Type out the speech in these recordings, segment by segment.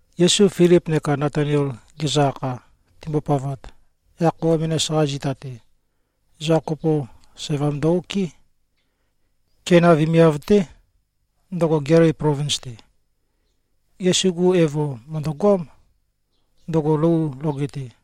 Yesu Filip neka Natanael gezø-akha, timbopavat, yaq khøuwa menas-qa zita-te, ezoqa kopo sævam ndø-okɨ́. Keina vemiav-té, ndøgo Gelili plovins-te. Yesu-gu evo mø̀ndøgoám, ndøgo lou loge-te.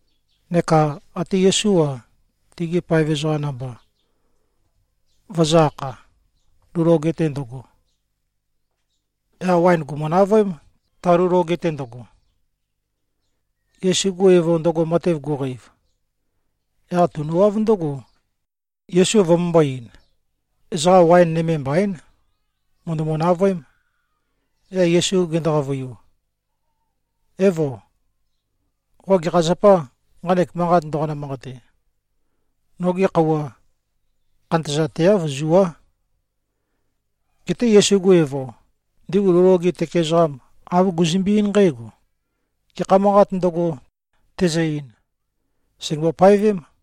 Neka ate Yesú-a, tegi paev ezoqa namba, vøzø̄-akha, lou loge-te ndøgo. Yaq waen gùmu-navøém, ta lou loge-te ndøgo. Yesu-gu evo ndøgo matev guqeiv, yaq tunøwáv ndǿgo, Yesu vømømbō-ein, “Ezoqa waen nøme mbaín. Mø̀ndømu-navøém.” Yaq Yesu gendo-qavøiu, “Évo. Qo gekha zapâ, nqanek manqat ndoqonø-manqate? Nogi khøuwa khantøzateáv. Zuá.” Geté Yesu-gu evo, ndigu lou loge tøke ezoqam, āv guzømbe-eín nqǽgo, “Gekha manqāt ndøgo, tezø-ein, sègembo-paevém.”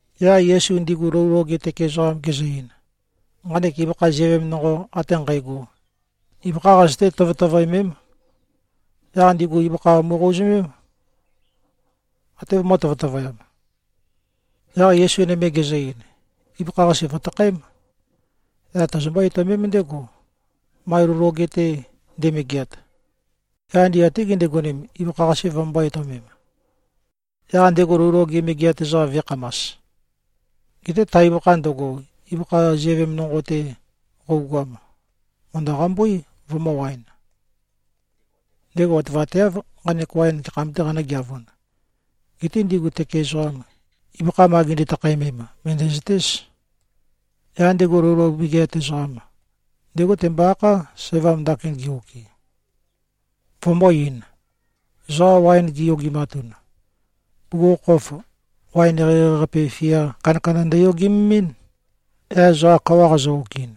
Yaq Yesu ndigu lou loge tøke ezoqam gezø-ein, “Nqanek ibøkha ziøvem nonqo ate nqægo, ibøkhá qazøté-tøtøvøemém.” Yaq ndigu ibøkha mu꞉qouzømém, até vømø̄-tøtøvøyam. Yaq Yesu nøme gezø-ein, “Ibøkha-qase vø̀takhaém. Yaq tozombó-etøomém ndégo, ma lou loge-te nde꞉megeat.” Yaq ndigu até gindigonem, ibøkha-qase vømømbō-etøomem, yaq ndego lou loge megeat ezoqam vø̄ekhamas. Geté ta ibøkha ndøgo, ibøkha ziøvem nonqo-te qøugoam, mø̀ndø-qambúi, vømø̄-waen. Ndego otevateáv, nqanek waen gekham-tē qanø̄geavun. Geté ndigu tøke ezoqam, ibøkha ma gindi-takhaemem, mø̀ndæzøtéz. Yaq ndego lou loge megeat ezoqam, ndégo tembo-akhá, sævam ndakin ge-okɨ, vømbō-ein, “Ezoqa waen giyogimatun, bugukhokhof waen eqeieqei-qape, fia kandakanda ndøyogememɨ́n. Yaq ezoqa kawa qazø-okɨin,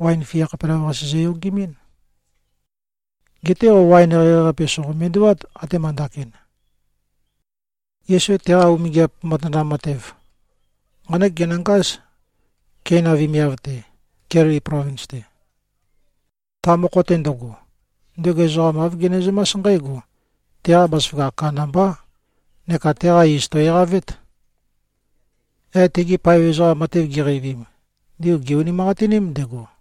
waen fia khapelavøqase zøyogemɨ́n. Geté qo waen eqeieqei-qape, sòqo-mendewát, atema ndakin.” Yesu teqa umingiap matanam matev, nqánek genøngáz, Keina vemiav-te, Gelili plovins-te. Ta mokho-te ndøgo, ndego ezoqa āv genezømás nqǽgo: Teqa bazaføgakh kandambá neka teqa iz, tò꞉-eqavét. Yaq tegi paev ezoqam matev giqeivim, ndigu gè-unimanqatiním ndego.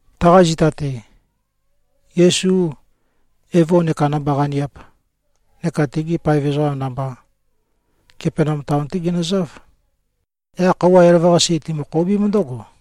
Taqa zita-te, Yesu, evo neka namba-qaniap neka tegi paev ezoqa namba, Kapenaum taon-té ginøzáv. Yaq khøuwa elavøqasi timø-khoubím ndǿgo.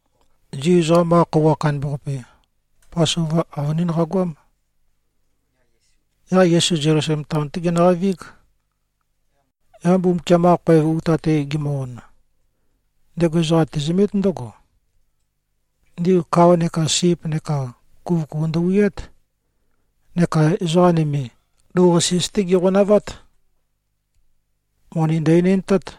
Zu ezoqam-qa khøuwa kandambaqape, Pasova, avønín qagoám. Yaq Yesu Zelusalem taon-té genøqavíg. Yaq Mbumbukiam-qa khoev uta-te gemø-on, ndego ezoqa tezømét ndǿgo. Ndigu kao neka sip neka kuvøkuvu ndøwiát, neka ezoqa nøme, lou-qasis-té giqonavát. Moni ndø-enendtát.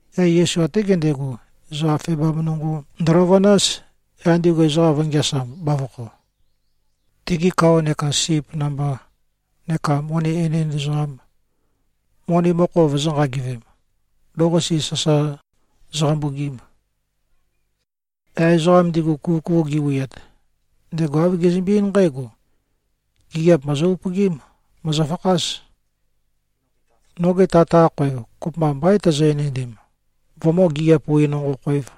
Yaq Yesu até gendego, ezoqa febam nonqo ndøløvønáz, yaq ndigu ezoqam vø̄ngeasam, bavokho, tigi kao neka sip namba, neka moni enend ezoqam, moni mokho vøzø̄-nqagivem, lou-qasis sasa zøqambugim. Yaq ezoqam ndigu, kuvøkuvu giwiat, ndego āv gezømbe-eín nqǽgo, “Gigiap mòzo-upøgím! Mòzofakház! Noge Tat-qa khoev, kopømba mbaín tozo-enendem, vømǿ-gigiap-wi-nonqo-khōev.”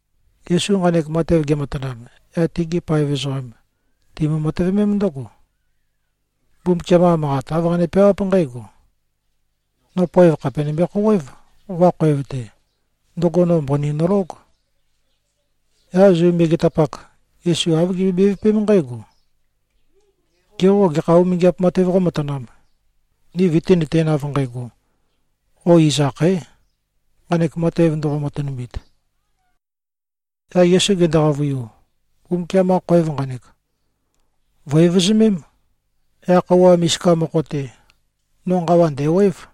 Yesu nqanek matev gematanam, yaq tegi paev ezoqam timbo-matøvømém ndǿgo. Mbumbukiam-qa Manqat, āv qane-peawáp nqǽgo, “No poev khàpe nømbe-khouwév, qoqa khoev-te. Ndøgo no mbøni nølóg.” Yaq Zu megetapak, Yesu āv gimbøe-bevøpém nqǽgo, “Ge qô, gekha umingiap matev qómatanām, ni vøtínøtēn av nqægo, qo iz akhaē, nqanek matev ndoqo-matønumit?” Yaq Yesu gendo-qavøiu, “Mbumbukiam-qa khoev nqanek, vø̀-evøzømém. Yaq khøuwa misika mokho-te, no nqawa ndæ̀wév.”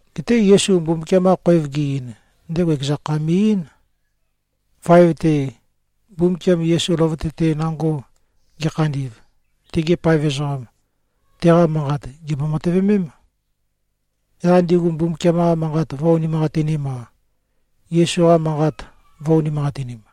Geté Yesu Mbumbukiam-qa khoev ge꞉-ein, ndego ekeza kha me꞉-eín. Vaev-te, Mbumbukiam Yesu løvøte-te nango ge꞉khandi꞉v, tegi paev ezoqam, teqa manqat gèmbo-matøvemém. Yaq ndigu Mbumbukiam-qa Manqat vø̄-unimanqatinim-a, Yesu-qa manqat vø̄-unimanqatinim.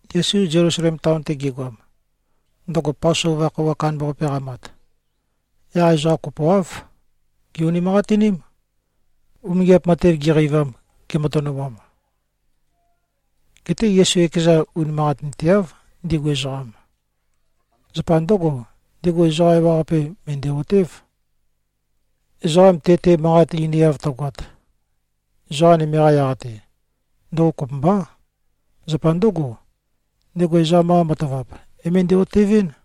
Yesu Zelusalem taon-te gegoam, ndøgo Pasova khøuwa kandambaqape qamat, yaq ezoqa kopoáv gè-unimanqatiním, umingiap matev giqeivam, gematønumam. Geté Yesu ekezan, unimanqatinteáv, ndigu ezoqam. Zapa ndǿgo, ndego ezoqa ewaqape mø̀ndæ-otév. Ezoqa te-te manqat einiav tøgoat, ezoqa nøme-qa yaq-te, ndøgo kopømbá. Zapa ndǿgo, ndego ezoqam-qa matavap, é-møndæ-otevɨ́n.